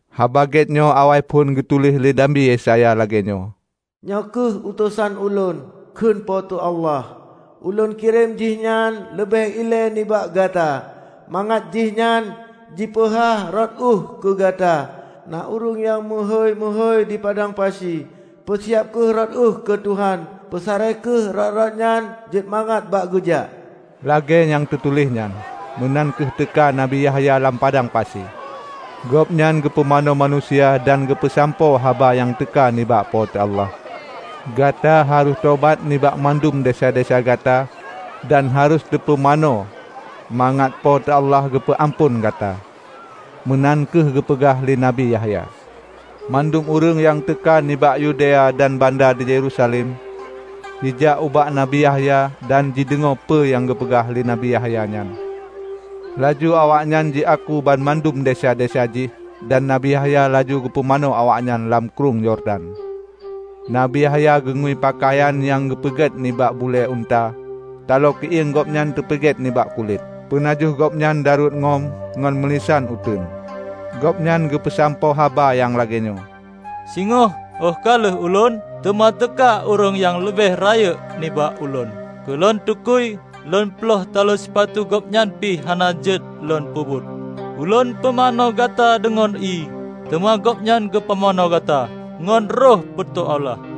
Haba Gét nyoe awaiphon geutuléh lé Nabi Yesaya lagée nyoe, " 'Nyoe kheueh utosan ulôn,' kheun po teu Allah; 'Ulôn kirém jihnyan leubeh ilée nibak Gata, mangat jihnyan jipeuhah rot ueh keu Gata.' Na ureuëng nyang meuhôi-meuhôi di padang pasi, 'Peusiab kheueh rot ueh keu Tuhan; peusaré kheueh rot-rot nyan jeuet mangat bak Geujak.' " Lagée nyang teutuléh nyan, meunan kheueh teuka Nabi Yahya lam padang pasi. Gobnyan geupumanö manusia dan geupeusampoe haba nyang teuka nibak Po teu Allah. "Gata harôh tobat nibak mandum desya-desya gata dan harôh teupumanö, mangat Po teu Allah geupeu amphon gata," meunan kheueh geupeugah lé Nabi Yahya. Mandum ureuëng nyang teuka nibak Yodea dan banda di Yerusalem jijak ubak Nabi Yahya dan jideungoe peue nyang geupeugah lé Nabi Yahya nyan. Laju awaknyan jiaku banmandum desya-desya jih, dan Nabi Yahya laju geupumanö awaknyan lam Krueng Yordan. Nabi Yahya geungui peukayan nyang teupeugét nibak bulée unta. Taloe keuieng gobnyan teupeugét nibak kulét, peunajoh gobnyan daruet ngon meulisan uteuen. Gobnyan geupeusampoe haba nyang lagée nyoe, "Singoh óh ka lheueh ulôn, teuma teuka ureuëng nyang leubeh rayeuk nibak ulôn. Keu lôn tukui lôn ploih taloe sipatu Gobnyan pih hana jeuet lôn peubuet. Ulôn pumanö gata deungon ié, teuma Gobnyan geupumanö gata ngon Roh Po teu Allah."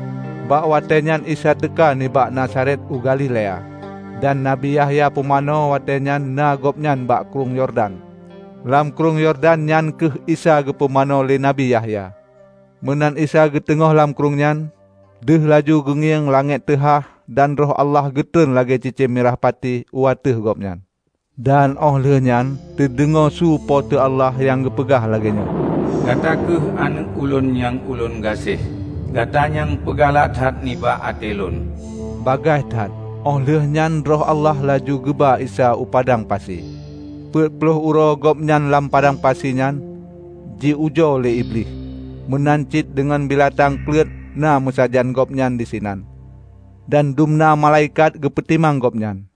Bak watée nyan Isa teuka nibak Nazaret u Galilea, dan Nabi Yahya Pumanö watée nyan na Gobnyan bak Krueng Yordan, lam Krueng Yordan nyan kheueh Isa geupumanö lé Nabi Yahya. Meunan Isa geuteungoh lam krueng nyan, deuh laju geungieng langét teuhah dan Roh Allah geutron lagée cicém mirah pati u ateueh Gobnyan. Dan óh lheueh nyan teudeungoe su Po teu Allah nyang geupeugah lagée nyoe, "Gata kheueh Aneuëk Ulôn nyang Ulôn gaséh. Gata nyang peugalak that nibak até Lôn." Bagaih that óh lheueh nyan Roh Allah laju geuba Isa u padang pasi. Peuet ploh uroe Gobnyan lam padang pasi nyan, ji-ujoe lé Iblih. Meunan cit deungon beulatang kleut na meusajan Gobnyan disinan, dan dumna malaikat geupeutimang Gobnyan.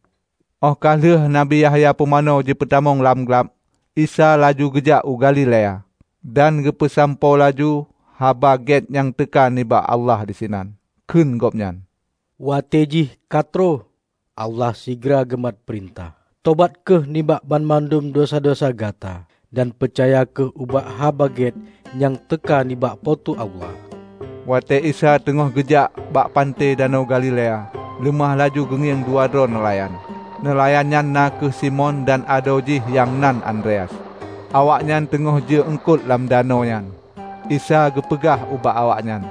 Óh ka lheueh Nabi Yahya Pumanö jipeutamong lam glab, Isa laju geujak u Galilea, dan geupeusampoe laju Haba Gét nyang teuka nibak Allah disinan. Kheun Gobnyan, "Watée jih ka troh, Allah sigra geumat peurintah. Tobat kheueh nibak banmandum desya-desya gata, dan peucaya kheueh ubak Haba Gét nyang teuka nibak Po teu Allah!" Watée Isa teungoh geujak bak panté Danau Galilea, leumah laju geungieng dua droe neulayan, neulayan nyan na kheueh Simon dan adoe jih nyang nan Andreas. Awaknyan teungoh jeue eungkot lam danau nyan. Isa geupeugah ubak awaknyan,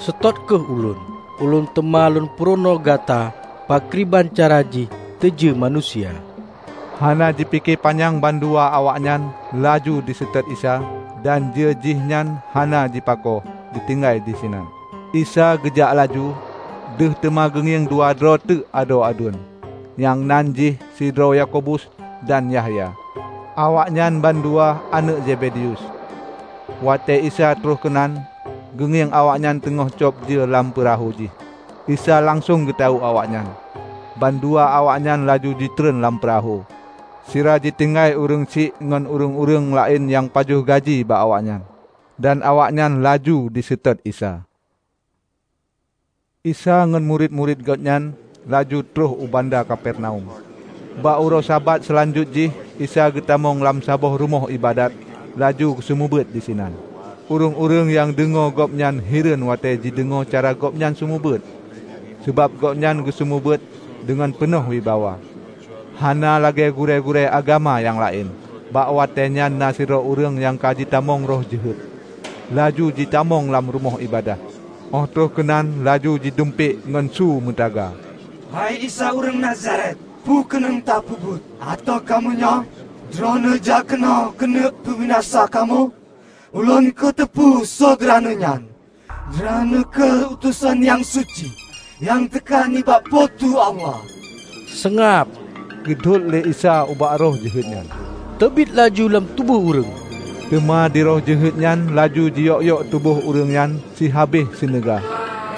"Seutôt kheueh ulôn, ulôn teuma lôn purunoe gata pakriban cara jih teujeue manusia." Hana jipike panyang bandua awaknyan laju jiseutôt Isa dan jeue jihnyan hana jipako jitinggai disinan. Isa geujak laju, deuh teuma geungieng dua droe teuk adoe aduen, nyang nan jih sidroe Yakobus dan Yahya, awaknyan bandua aneuëk Zebedeus. Watée Isa troh keunan, geungieng awaknyan teungoh cob jeue lam peurahô jih. Isa langsong geutawök awaknyan. Bandua awaknyan laju jitron lam peurahô sira jitinggai ureuëng syiek ngon ureuëng-ureuëng laén nyang pajoh gaji bak gobnyan. Dan awaknyan laju jiseutôt Isa. Isa ngon murit-murit Gobnyan laju troh u banda Kapernaum. Bak uroe Sabat seulanjut jih, Isa geutamong lam saboh rumoh iébadat laju geuseumeubeuet disinan. Ureuëng-ureuëng nyang deungoe Gobnyan hireuen watée jideungoe cara Gobnyan seumeubeuet. Sabab, Gobnyan geuseumeubeuet deungon peunoh wibawa, hana lagée gurée-gurée agama nyang laén. Bak watée nyan na sidroe ureuëng nyang ka jitamong roh jeuhet laju jitamong lam rumoh iébadat, óh troh keunan laju jidumpék ngon su meutaga, "Hei Isa ureuëng Nazaret, peue keuneuk ta peubuet ateueh kamoe nyoe? Droeneueh jak keunoe keuneuk peubinasa kamoe? Ulôn kuteupeu soe Droeneueh nyan: Droeneueh kheueh utosan nyang suci nyang teuka nibak Po teu Allah!" "Seungab!" geudhôt lé Isa ubak roh jeuhet nyan, "teubiet laju lam tuboh ureuëng!" Teuma di roh jeuhet nyan laju jiyok-yok tuboh ureuëng nyan sihabéh seuneuga,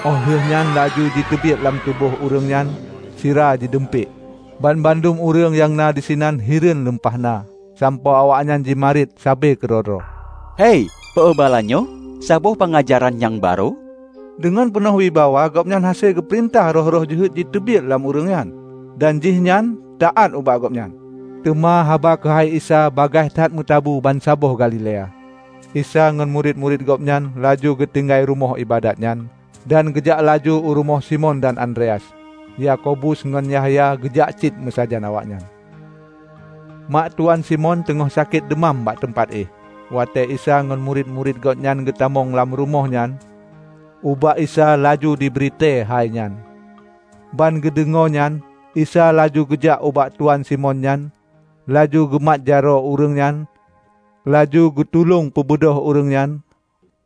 óh lheueh nyan laju jiteubiet lam tuboh ureuëng nyan sira jidumpék. Banmandum ureuëng nyang na disinan hireuen lumpah na, sampoe awaknyan jimarit sabe keudroe-droe, "Hei, peue bala nyoe? Saboh peungajaran nyang barô! Deungon peunoh wibawa gobnyan hase geupeurintah roh-roh jeuhet jiteubiet lam ureuëng nyan, dan jihnyan taát ubak Gobnyan!" Teuma haba keuhai Isa bagaih that meutabu bansaboh Galilea. Isa ngon murit-murit Gobnyan laju geutinggai rumoh iébadat nyan dan geujak laju u rumoh Simon dan Andreas. Yakobus ngon Yahya geujak cit meusajan awaknyan. Mak tuan Simon teungoh sakét deumam bak teumpat éh. Watée Isa ngon murit-murit Gobnyan geutamong lam rumoh nyan, ubak Isa laju jibri tée hainyan. Ban geudeungoe nyan, Isa laju geujak ubak tuan Simon nyan, laju geumat jaroe ureuëng nyan, laju geutulông peubeudôh ureuëng nyan.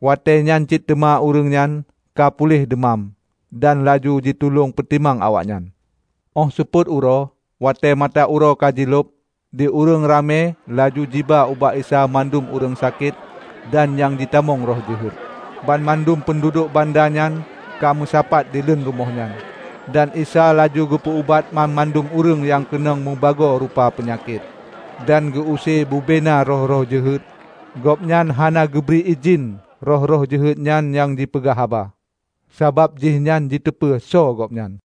Watée nyan cit teuma ureuëng nyan ka puléh deumam dan laju jitulông peutimang awaknyan. Óh seupôt uroe, watée mata uroe ka jilhob, di ureuëng ramé laju jiba ubak Isa mandum ureuëng sakét dan nyang jitamong roh jeuhet. Banmandum peunduduek banda nyan ka meusapat dileuen rumoh nyan. Dan Isa laju geupeu ubat banmandum ureuëng nyang keunong meubagoe rupa peunyakét, dan geu use bubena roh-roh jeuhet. Gobnyan hana geubri idhin roh-roh jeuhet nyan jipeugah haba, sabab jihnyan jiteupeu soe Gobnyan.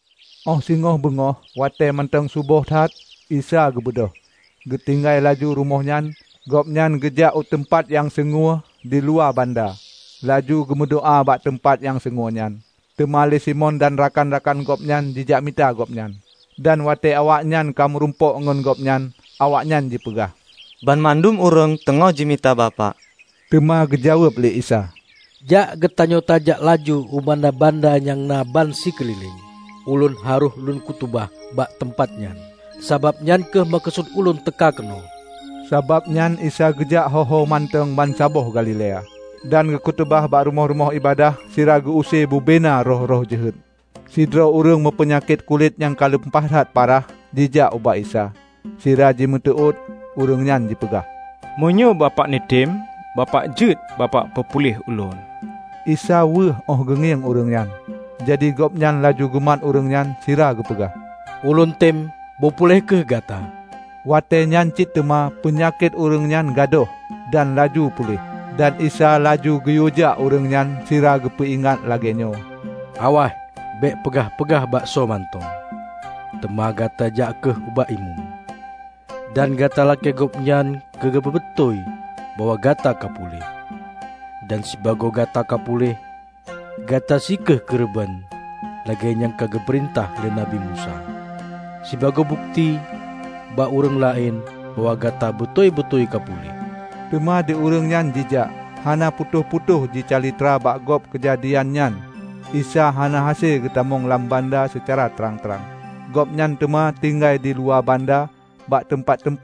Óh singoh beungoh, watée mantong suboh that, Isa geubeudôh geutinggai laju rumoh nyan. Gobnyan geujak u teumpat nyang sungue diluwa banda, laju geumeudoá bak teumpat nyang sungue nyan. Teuma lé Simon dan rakan-rakan gobnyan jijak mita gobnyan. Dan watée awaknyan ka meurumpok ngon gobnyan, awaknyan jipeugah, "Banmandum ureuëng teungoh jimita bapak." Teuma geujaweueb lé Isa, "Jak geutanyoe tajak laju u banda-banda nyang na ban sikeulileng. Ulôn harôh lôn khutubah bak teumpat nyan, sabab nyan kheueh meukeusut ulôn teuka keunoe." Sabab nyan Isa geujak ho-ho mantong bansaboh Galilea, dan geukhutubah bak rumoh-rumoh iébadat sira geu use bubena roh-roh jeuhet. Sidroe ureuëng meupeunyakét kulét nyang ka lumpah that parah jijak ubak Isa. Sira jimeuteuôt ureuëng nyan jipeugah, "Meunyoe Bapak neutém, Bapak jeuet Bapak peupuléh ulôn." Isa weueh óh geungieng ureuëng nyan. Jadi, Gobnyan laju geumat ureuëng nyan sira geupeugah, "Ulôn tem, beupuléh kheueh gata!" Watée nyan cit teuma peunyakét ureuëng nyan gadôh dan laju puléh. Dan Isa laju geuyuejak ureuëng nyan sira geupeu ingat lagée nyoe, "Awaih, bék peugah-peugah bak soe mantong, teuma gata jak kheueh ubak imeum, dan gata lakée gobnyan keu geupeubeutôi bahwa gata ka puléh. Dan sibagoe gata ka puléh, gata sie kheueh keureubeuen lagée nyang ka geupeurintah lé Nabi Musa, sibagoe bukeuti bak ureuëng laén bahwa gata beutôi-beutôi ka puléh." Teuma di ureuëng nyan jijak, hana putôh-putôh jicalitra bak gob keujadian nyan Isa hana hase geutamong lam banda seucara trang-trang. Gobnyan teuma tinggai diluwa banda bak teumpat-